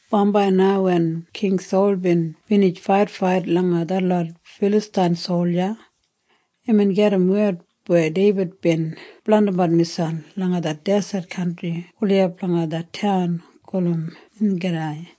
Bambai na wen King Sol bin binij faitfait langa detlot Filastain solja, imbin gedim wed weya Deibid bin blandimbat miselp langa det deset kantri gulijap langa det taun gulum Engedi.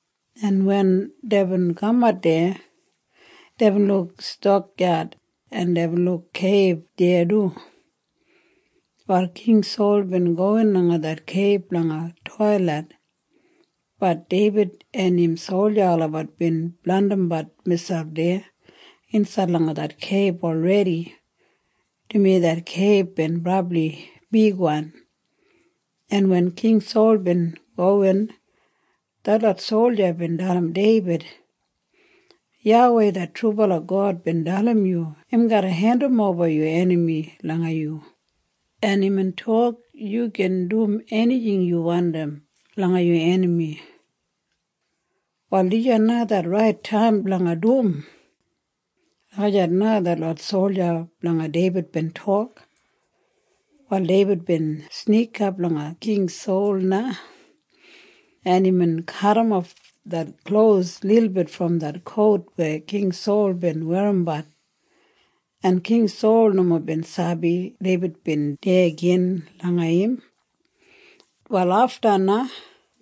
en wen deibin kamat deya, deibin luk stakyad, en deibin luk keib deya du. Wal King Sol bin gowin langa det keib blanga toilit. Bat Deibid en im solja olabat bin blandimbat miselp deya insaid langa det keib olredi, dumaji det keib bin brabli bigwan, en wen King Sol bin gowin, detlot solja bin dalim Deibid, “YAWEI det trubala God bin dalim yu im garra hendimoba yu enami langa yu, en imbin tok yu gin dum enijing yu wandim langa yu enami. Wal dijan na det rait taim blanga dum.” Lagijat na detlot solja blanga Deibid bin tok. Wal Deibid bin snikap langa King Sol na, en imbin kadimof det klos lilbit brom det kout weya King Sol bin werrimbat, en King Sol nomo bin sabi Deibid bin deya gin langa im. Wal afta na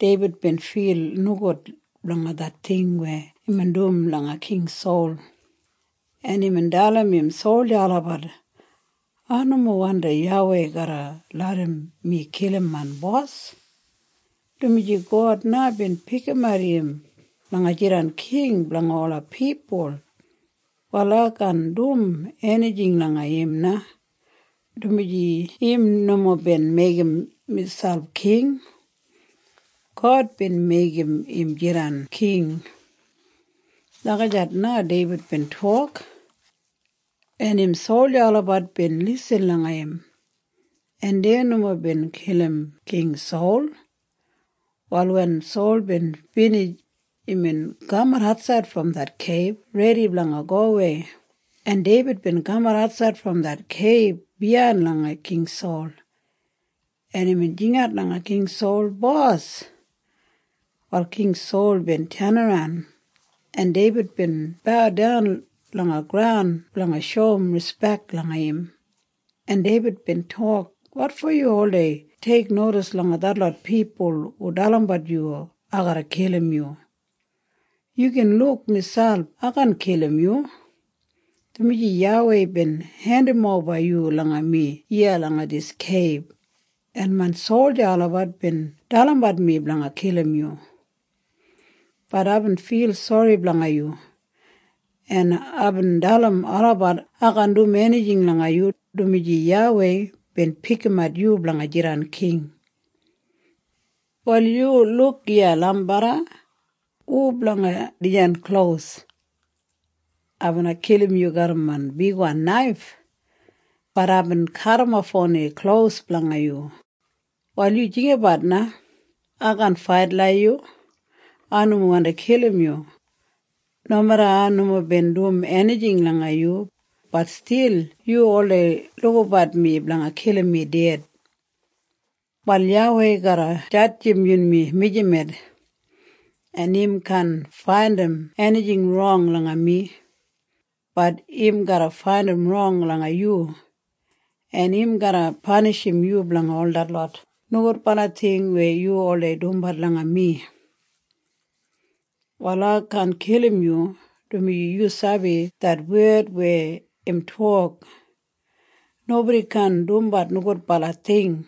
Deibid bin fil nogud blanga det ting weya imbin dum langa King Sol, en imbin dalim im solja olabat, “Ai nomo wandim YAWEI garra larram mi kilim main bos, dumaji God na bin pikimat im blanga jidan king blanga ola pipul. Wal ai kaan dum enijing langa im na, dumaji im nomo bin meigim miselp king. God bin meigim im jidan king.” Lagijat na Deibid bin tok. En im solja olabat bin lisin langa im, en dei nomo bin kilim King Sol. Wal wen Sol bin binij, imbin kamat atsaid brom det keib redi blanga gowei, en Deibid bin kamat atsaid brom det keib biyain langa King Sol, en imbin jingat langa King Sol, “Bos!” Wal King Sol bin tenaran, en Deibid bin baudan langa graun blanga shoum rispek langa im, en Deibid bin tok, “Wotfo yu oldei teiknodis langa detlot pipul hu dalimbat yu ai garra kilim yu? Yu gin luk miselp ai kaan kilim yu, dumaji YAWEI bin hendimoba yu langa mi iya langa dis keib, en main solja olabat bin dalimbat mi blanga kilim yu. Bat aibin fil sori blanga yu, en aibin dalim olabat ai kaan dum enijing langa yu, dumaji YAWEI bin pikimat yu blanga jidan king. “Wal yu luk iya, lambarra. Hu blanga dijan klos? Ai bina kilim yu garram main bigwan naif. Bat aibin kadimof oni klos blanga yu. Wal yu jinggabat na. Ai kaan fait langa yu. Ai nomo wandi kilim yu. Nomeda ai nomo bin dum enijing langa yu, bat stil yu oldei lukabat mi blanga kilim mi ded. Wal YAWEI garra jadjim yunmi mijamet, en im kaan faindim enijing rong langa mi. Bat im garra faindim rong langa yu, en im garra panishim yu blanga ol detlot nogudbala ting weya yu oldei dumbat langa mi. “Wal ai kaan kilim yu, dumaji yu sabi det wed weya im tok, ‘Nobodi kaan dumbat nogudbala ting.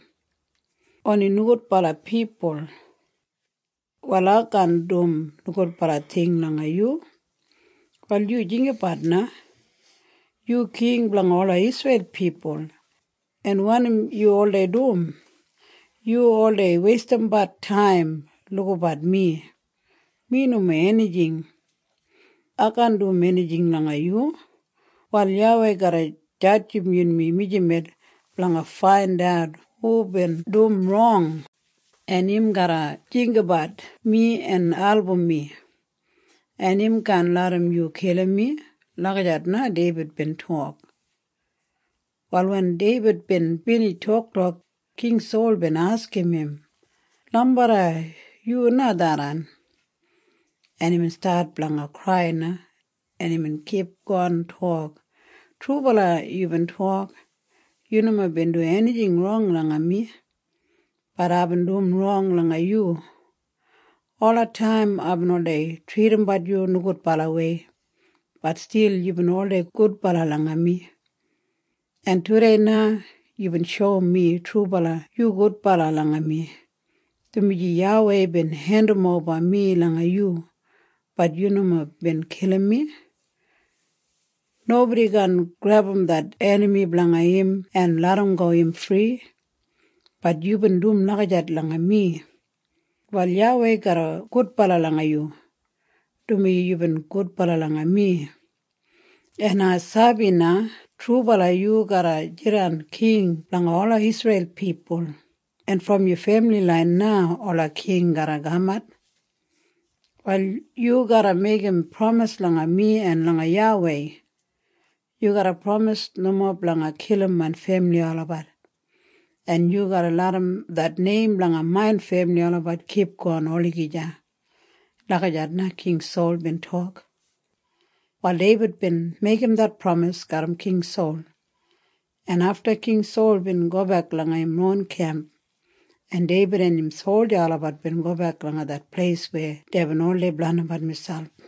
Oni nogudbala pipul.’ Wal ai kaan dum nogudbala ting langa yu. “Wal yu jinggabat na. Yu king blanga ola Isreil pipul. En wanim yu oldei dum? Yu oldei weistimbat taim lukabat mi. Mi nomo enijing. Ai kaan dum enijing langa yu. Wal YAWEI garra jadjim yunmi mijamet blanga faindat hubin dum rong, en im garra jinggabat mi en album mi, en im kaan larram yu kilim mi.” Lagijat Deibid bin tok. Wal wen Deibid bin binij toktok, King Sol bin askim im, “Lambarra, yu na tharran?” En imbin stat blanga krai na, en imbin kipgon tok, “Trubala yubin tok. Yu nomo bin dum enijing rong langa mi. Bat aibin dum rong langa yu. Olataim aibin oldei tridimbat yu nogudbalawei. Bat stil yubin oldei gudbala langa mi, en tudei na yubin shoum mi trubala yu gudbala langa mi, dumaji YAWEI bin hendimoba mi langa yu. Bat yu nomo bin kilim mi. Nobodi kaan grebum det enami blanga im en larramgo im fri. Bat yubin dum lagijat langa mi. Wal YAWEI garra gudbala langa yu, dumaji yubin gudbala langa mi. En ai sabi na trubala yu garra jidan king blanga ola Isreil pipul, en brom yu femili lain na ola king garra kamat. “Wal yu garra meigim pramis langa mi en langa YAWEI. Yu garra pramis nomo blanga kilim main femili olabat, en yu garra larram det neim blanga main femili olabat kipgon olagija.” Lagijat na King Sol bin tok. Wal Deibid bin meigim det pramis garram King Sol, en afta King Sol bin gobek langa im ron kemp, en Deibid en im solja olabat bin gobek langa det pleis weya deibin oldei blandimbat miselp.